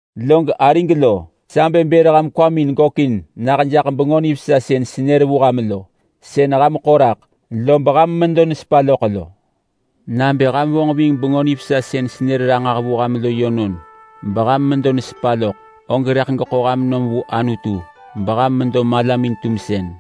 Log arig lo, sa bë bër ham kwamin gökin nah jaḳ Bengö Nivesa sën senër vu ham lo. Sën ham ḳo raḳ lob ham medo nesepa loḳ lo. Nabë ham vonġ ving Bengö Nivesa sën senër ranġah vu ham lo yönon, beham medo nesepa loḳ, og rëḳ geḳo ham nom vu Anutu beham medo malamin-tumsën.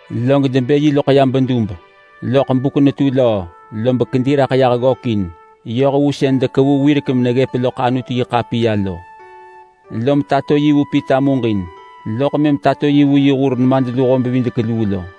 Log debë yi loḳ ya bedub. Loḳ buk netu löö, lob kedi raḳ yah ggökin yoh vu sën dekevu wirek meneggëp loḳ Anutu-yi-ḳapiya lo. Lom tato yi vu Pita muġin, loḳ mëm tato yi vu yi hur nemadluho-bevidek-luu lo.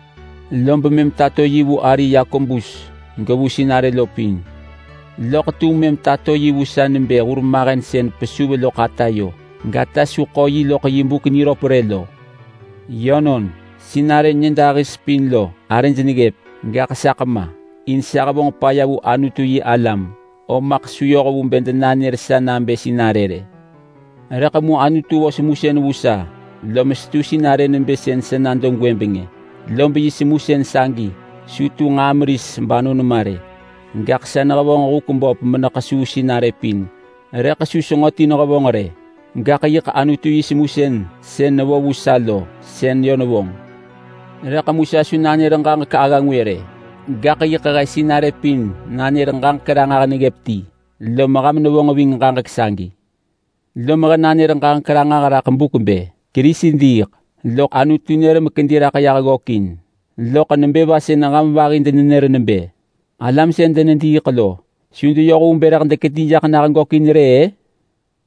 Lob mëm tato yi vu ari Yakobus, gevu sinarë lo pin. Loḳ tum mëm tato yi vu sa nebë hurmahen sën pesuv loḳ atayo, gata su ḳo yi loḳ yi buk niröp rë lo. Yönon, sinarë nyëdahis pin lo arëj neggëp, gaḳ saḳ ma! In sa hevonġ paya vu Anutu-yi-alam, om maḳ su yoh vu bë denanër sa nabë sinarë rë. Rëḳ mu Anutu vo semusën vu sa, lom setu sinarë nebë sën sa nado gwëbeng-ë, lob yi semusën sagi su tu nġaa meris banon ma rë, gaḳ sa nehevonġ huk böp menekesuu sinarë pin. Rëḳ su senġo ti nehevonġ rë, gaḳ yiḳ Anutu yi semusën sën nevo vu sa lo, sën yö nevonġ. Rëḳ mu sa su nanër ġaġek agga ngwë rë, gaḳ yiḳ he sinarë pin nanër ġaġek ranġah neggëp ti, lom ham nevonġ ving ġaġek sagi. Lom he nanër ġaġek ranġah raḳ buk bë: Kerisi diiḳ, loḳ Anutu nër mekedi raḳ yah ggökin. Loḳ nebë va sën ham vahi denenër nebë, “Alam sën denediiḳ lo su deyoh vu bë rëḳ dekedi jaḳ nah gökin rë”—ë?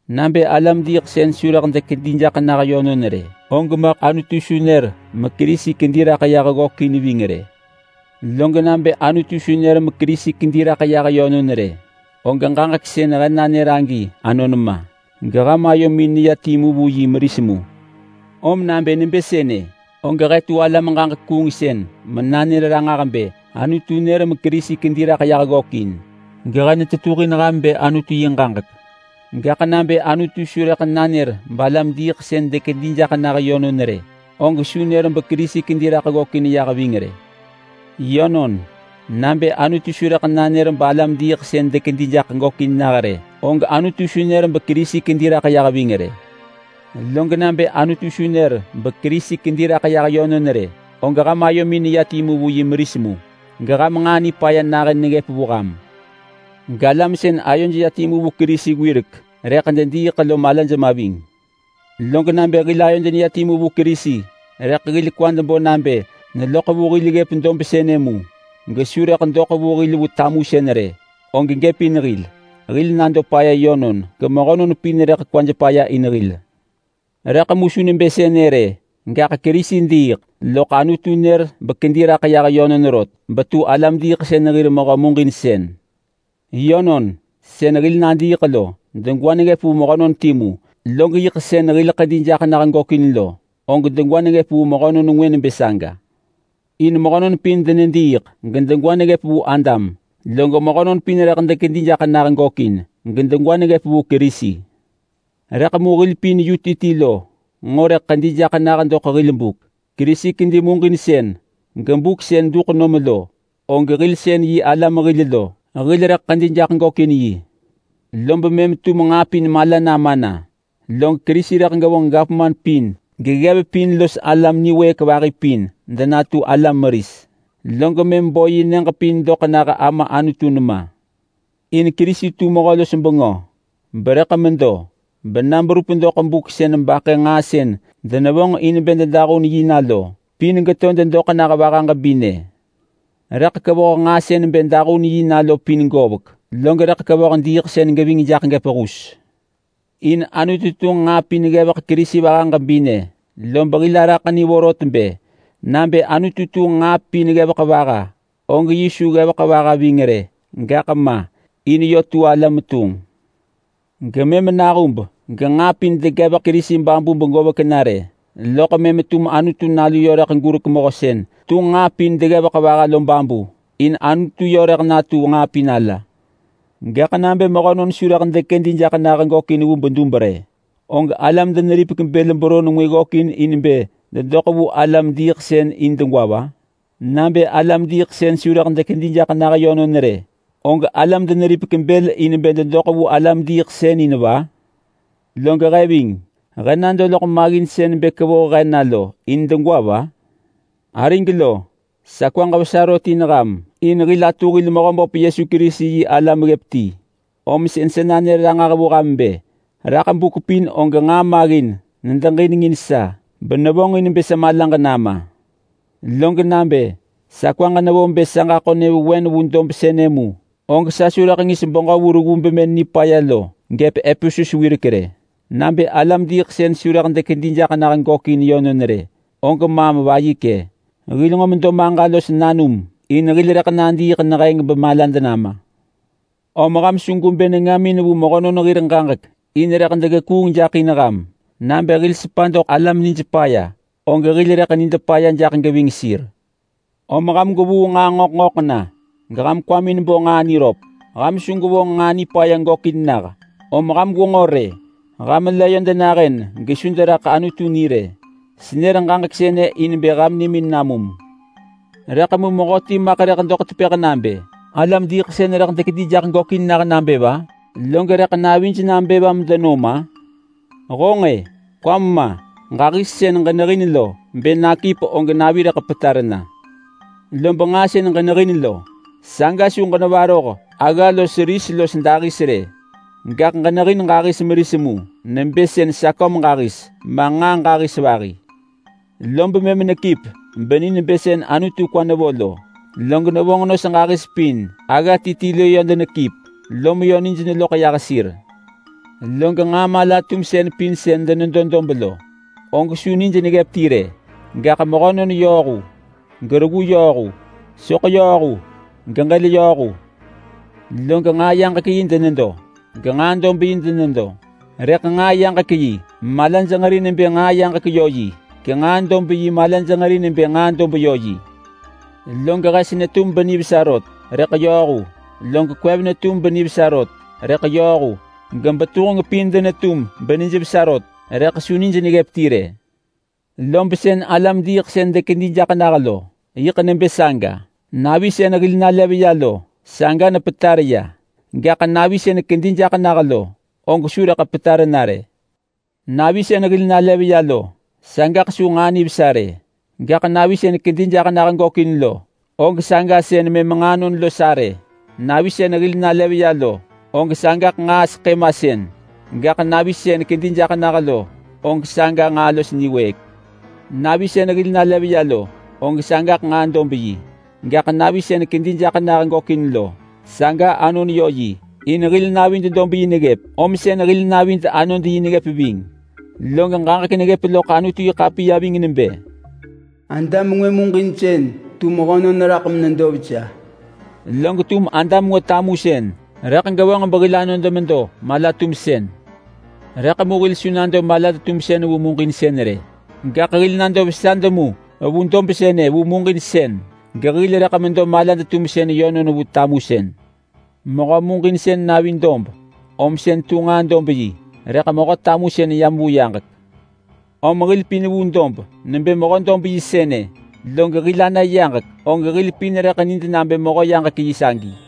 Nabë alam-diiḳsën su rëḳ dekedi jaḳ nah yönon rë, og Anutu su nër meKerisi kedi raḳ ving rë! Log nabë Anutu su nër meKerisi kedi raḳ yah yönon rë, og ġaġek sën he nanër-ë anon ma, geham ayomin neya timu vu yi meris mu. Om nabë nebë sënë, og he tu alam-ġaġek-kuungsën menanër ranġah bë Anutu nër meKerisi kedi raḳ yah ggökin, gehe netetuhin ham bë Anutu yi ġaġek. Gaḳ nabë Anutu su rëḳ nanër balam-diiḳsën dekedi jaḳ nah yönon rë, og su nër beKerisi kedi raḳ ggökin yah ving rë! Yönon, nabë Anutu su rëḳ nanër balam-diiḳsën dekedi jaḳ gökin nah rë, og Anutu su nër beKerisi kedi raḳ yah ving rë. Log nabë Anutu su nër beKerisi kedi raḳ yah yönon rë, og ham ayomin neya timu vu yi meris mu, geham nġaa nipaya nahën neggëp vu ham. Galam sën ayoj ya timu vu Kerisi wirek rëḳ dediiḳ lo malaj ma ving. Log nabë hil ayod neya timu vu Kerisi, rëḳ hil kwad bo nabë neloḳ vu hil ggëp dob sënë mu, gesu rëḳ doḳ vu hil vu tamusën rë, og gëp in hil. Hil nado paya yönon gemehönon pin rëḳ kwaj paya in hil. Rëḳ mu su nebë sënë rë! Gaḳ Kerisi diiḳ, loḳ Anutu nër bekedi raḳ yah yönon rot, betu alam-diiḳsën hir mehö muġinsën. Yönon! Sën hil nadiiḳ lo degwa neggëp vu mehönon timu, log yiḳ sën hil ḳedi jaḳ nah gökin lo, og degwa neggëp vu mehönon ngwë nebë saga. In mehönon pin denediiḳ gedegwa neggëp vu Adam, log mehönon pin rëḳ dekedi jaḳ nah gökin gedegwa neggëp vu Kerisi. Rëḳ mu hil pin yu ti ti lo nġo rëḳ ḳedi jaḳ nah doḳ hil buk. Kerisi kedi muġinsën gebuk sën duḳ nom lo, og hil sën yi alam hil lo, hil rëḳ ḳedi jaḳ gökin yi. Lob mëm tum nġaa pin mala nama na, log Kerisi rëḳ gevonġ gavman pin geggev pin los alam niwëëk vahi pin denatu alam meris, log mëm bo yi nyëġ pin doḳ nah Ama Anutu nema. In Kerisi tu Mehö-los-bengö berëḳ medo bena berup doḳ buk sën baḳë nġaa sën denevonġ in bë dedahun yi na lo pin geto dedoḳ nah vaha ġebinë. Rëḳ kevoh nġaa sën bë dahun yi na lo pin govek, log rëḳ kevoh diiḳsën geving jaḳ gëp hus. In Anutu tunġ nġaa pin ggevek Kerisi vaha ġebinë, lob hil araḳ ni vorot bë: Nabë Anutu tunġ nġaa pin ggevek vaha, og yi su ggevek vaha ving rë gema, in yö tu ala metunġ. Gemëm nahub genġaa pin degevek Kerisi babu begovek na rë, loḳ mëm tum Anutu Nalu yö rëḳ gurek Mehö sën tunġ nġaa pin deggevek vaha lo babu, in Anutu yö rëḳ natu nġaa pin ala. Gaḳ nabë mehönon su rëḳ dekedi jaḳ nah gökin vu bedub rë, og alam deneripek bël beron ngwë ggökin in bë dedoḳ vu alam-diiḳsën in degwa va? Nabë alam-diiḳsën su rëḳ dekedi jaḳ nah yönon rë, og alam deneripek bël in bë dedoḳ vu alam-diiḳsën in va? Log he ving! He nado loḳ maggin sën bë kevoh he na lo in degwa va? Arig lo, sa kwaġ vesa rot in ham in hil atu hil Mehöböp Yesu Kerisi yi alam ggëp ti, om sën sa nanër ranġah vu ham bë: Raḳ buk pin og nġaa maggin nedeġinengin sa benevonġin bë sa malaġ nama. Log nabë sa kwaġ nevo bë sa ġaḳo nyëvewen vu dob sënë mu, og sa su rëḳ ngis beġö vu reggu bemën nipaya lo gëp Epesus wirek rë. Nabë alam-diiḳsën su rëḳ dekedi jaḳ nah gökin yönon rë, og maam vayikë: “Hil nġo medo maġa los nanum in hil rëḳ nadiiḳ neheng bemalad nama.” Om ham su gwebë nengamin vu mehönon hir ġaġek in rëḳ degekuung jaḳ in ham. Nabë hil sepa doḳ alam nij paya, og hil rëḳ nid paya jaḳ geving sir. Om ham gwevuu nġaa ngöḳ ngöḳ na geham kwamin bo nġaa niröp. Ham su gwevonġ nġaa nipaya gökin nah. Om ham gwenġo rë! Ham la yö denahën gesu deneraḳ Anutu ni rë. Senër ġaġek sënë in bë ham nimin namum. Rëḳ mu mehöti maḳ rëḳ doḳ tepëḳ nabë, “Alam diiḳsën rëḳ dekedi jaḳ nah nabë va? Log rëḳ navij nabë va medenom-a?” Honġ-e! Kwam ma! Ġahis sën ġenehin lo, bë nakip og navi rëḳ petar na. Lob nġaa sën ġenehin lo, saga su ġenevaroh agga los ris los dahis rë. Gaḳ ġenehin ġahis meris mu nebë sën saköm ġahis ma nġaa ġahis vahi. Lob mëm nekip beni nebë sën Anutu kwa nevo lo. Log nevonġ nos ġahis pin agga ti ti lo yö denekip lom yö nij neloḳ yah sir. Log nġaa mala-tumsën pin sën denedo dob lo, og su nij neggëp ti rë. Gaḳ mehönon yööhu gereggu yööhu. Soḳ yööhu geġël yööhu. Log nġaa yaġek yi denedo, genġaa dob yi denedo, rëḳ nġaa yaġek yi malaj nġeri nebë nġaa yaġek yö yi, genġaa dob yi malaj nġeri nebë nġaa dob yö yi. Log hes netum benivesa rot rëḳ yööhu, log kwev netum benivesa rot rëḳ yööhu, gebetuheng pin denetum benijvesa rot, rëḳ su nij neggëp ti rë. Lob sën alam-diiḳsën dekedi jaḳ nah lo yiḳ nebë saga. Navi sën hil nalev ya lo, saga nepetar ya. Gaḳ navi sën kedi jaḳ nah lo, og su rëḳ petar na rë. Navi sën hil nalev ya lo, sagaḳ su nġaa nivesa rë, gaḳ navi sën kedi jaḳ nah gökin lo, og saga sën mëm nġaa anon los arë. Navi sën hil nalev ya lo, og sagaḳ nġaa seḳë masën, gaḳ navi sën kedi jaḳ nah lo, og saga nġaa los niwëëk. Navi sën hil nalev ya lo, og sagaḳ nġaa dob yi, gaḳ navi sën kedi jaḳ nah gökin lo, saga anon yö yi. In hil navid dob yi neggëp om sën hil navid anod yi neggëp ving. Log ġaġek neggëp loḳ Anutu-yi-ḳapiya ving nebë, “Adam ngwë muġinsën tu mehönon raḳ menedo vesa”, log tum Adam ngwë tamusën rëḳ gevonġ behil anod medo mala-tumsën. Rëḳ mu hil su nado malad-tumsën vu muġinsën rë, gaḳ hil nado vesad mu vu dob sënë vu muġinsën gehil rëḳ medo malad-tumsën yönon vu tamusën. Mehö muġinsën navi dob, om sën tu nġaa dob yi, rëḳ mehö tamusën yam vu yaġek. Om hil pin vu dob nebë mehö-dob-yi sënë, log hil ana yaġek, og hil pin rëḳ nid nabë mehö-yaġek-yi sagi.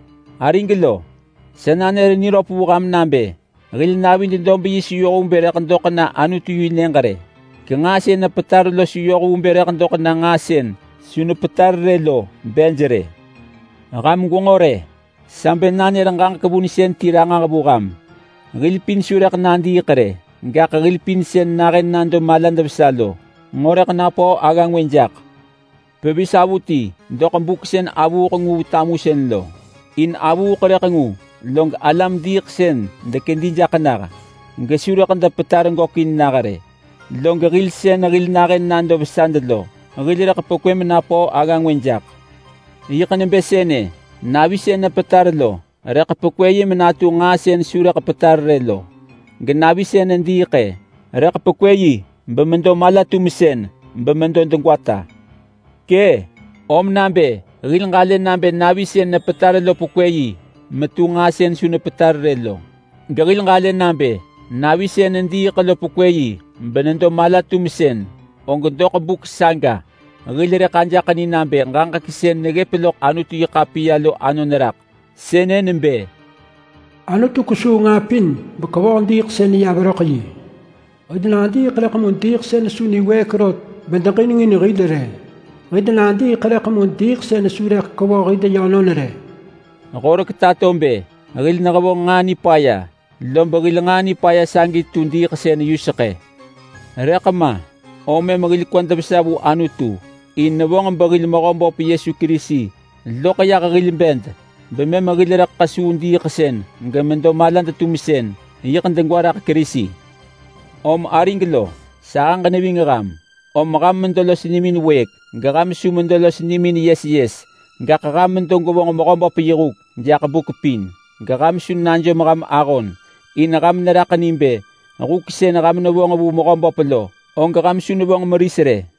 Arig lo, sa nanër niröp vu ham nabë hil navid dob yi su yoh vu bë doḳ na Anutu-yi-Nyëġ rë, genġaa sën nepetar lo su yoh vu bë doḳ na nġaa sën su nepetar rë lo bej rë. Ham gwenġo rë! Sa bë nanër ġaġek vunsën ti ranġah vu ham: Hil pin su rëḳ nadiiḳ rë! Gaḳ hil pin sën nahën nado malad vesa lo nġo rëḳ napöö agga ngwë jak pevis avuti doḳ buk sën avuuḳ ngu vu tamusën lo. In avuuḳ rëḳ ngu, log alam-diiḳsën dekedi jaḳ nah gesu rëḳ depetar gökin nah rë. Log hil sën hil nahën nado vesad lo, hil rëḳ pekwë menapöö agga ti jaḳ. Yiḳ nebë sënë: Navi sën nepetar lo rëḳ pekwë menatu nġaa sën su rëḳ petar rë lo, genavi sën nediiḳ-ë, rëḳ pekwë bemedo mala-tumsën bemedo degwata. Kë! Om nabë hil ġalë nabë navi sën nepetar lo pekwë yi metu nġaa sën su nepetar rë lo, gehil ġalë nabë navi sën nediiḳ lo pekwë yi benedo mala-tumsën, og doḳ buk saga hil rëḳ ajaḳ ni nabë ġaġek sën neggëp loḳ Anutu-yi-ḳapiya lo anon raḳ. Sënë nebë, “Anutu kesuu nġaa pin bekevoh diiḳsën ya veröḳ yi.” “Hil nadiiḳ rëḳ mu diiḳsën su niwëëk rot bedeġinengin hil rë. Hil nadiiḳ rëḳ mu diiḳsën su rëḳ kevoh hil yönon rë.” Horek tato bë hil nehevonġ nġaa nipaya, lob hil nġaa nipaya sagi tu diiḳsën yuseḳë. Rëḳ ma, om mëm hil kwad vesa vu Anutu in nevonġ behil Mehöböp Yesu Kerisi loḳ yah hil bed bemëm hil rëḳ ḳesuu diiḳsën gemedo malad-tumsën, yiḳ degwa raḳ Kerisi. Om arig lo, sahëġ neving ham, om ham medo los nimin wëëk geham su medo los nimin yes yes. Gaḳ ham medo gwevonġ Mehöböp yi huk jaḳ buk pin geham su najom ham ahon, in ham neraḳ ni nebë huk sën ham nevonġ vu Mehöböp lo og ham su nevonġ meris rë.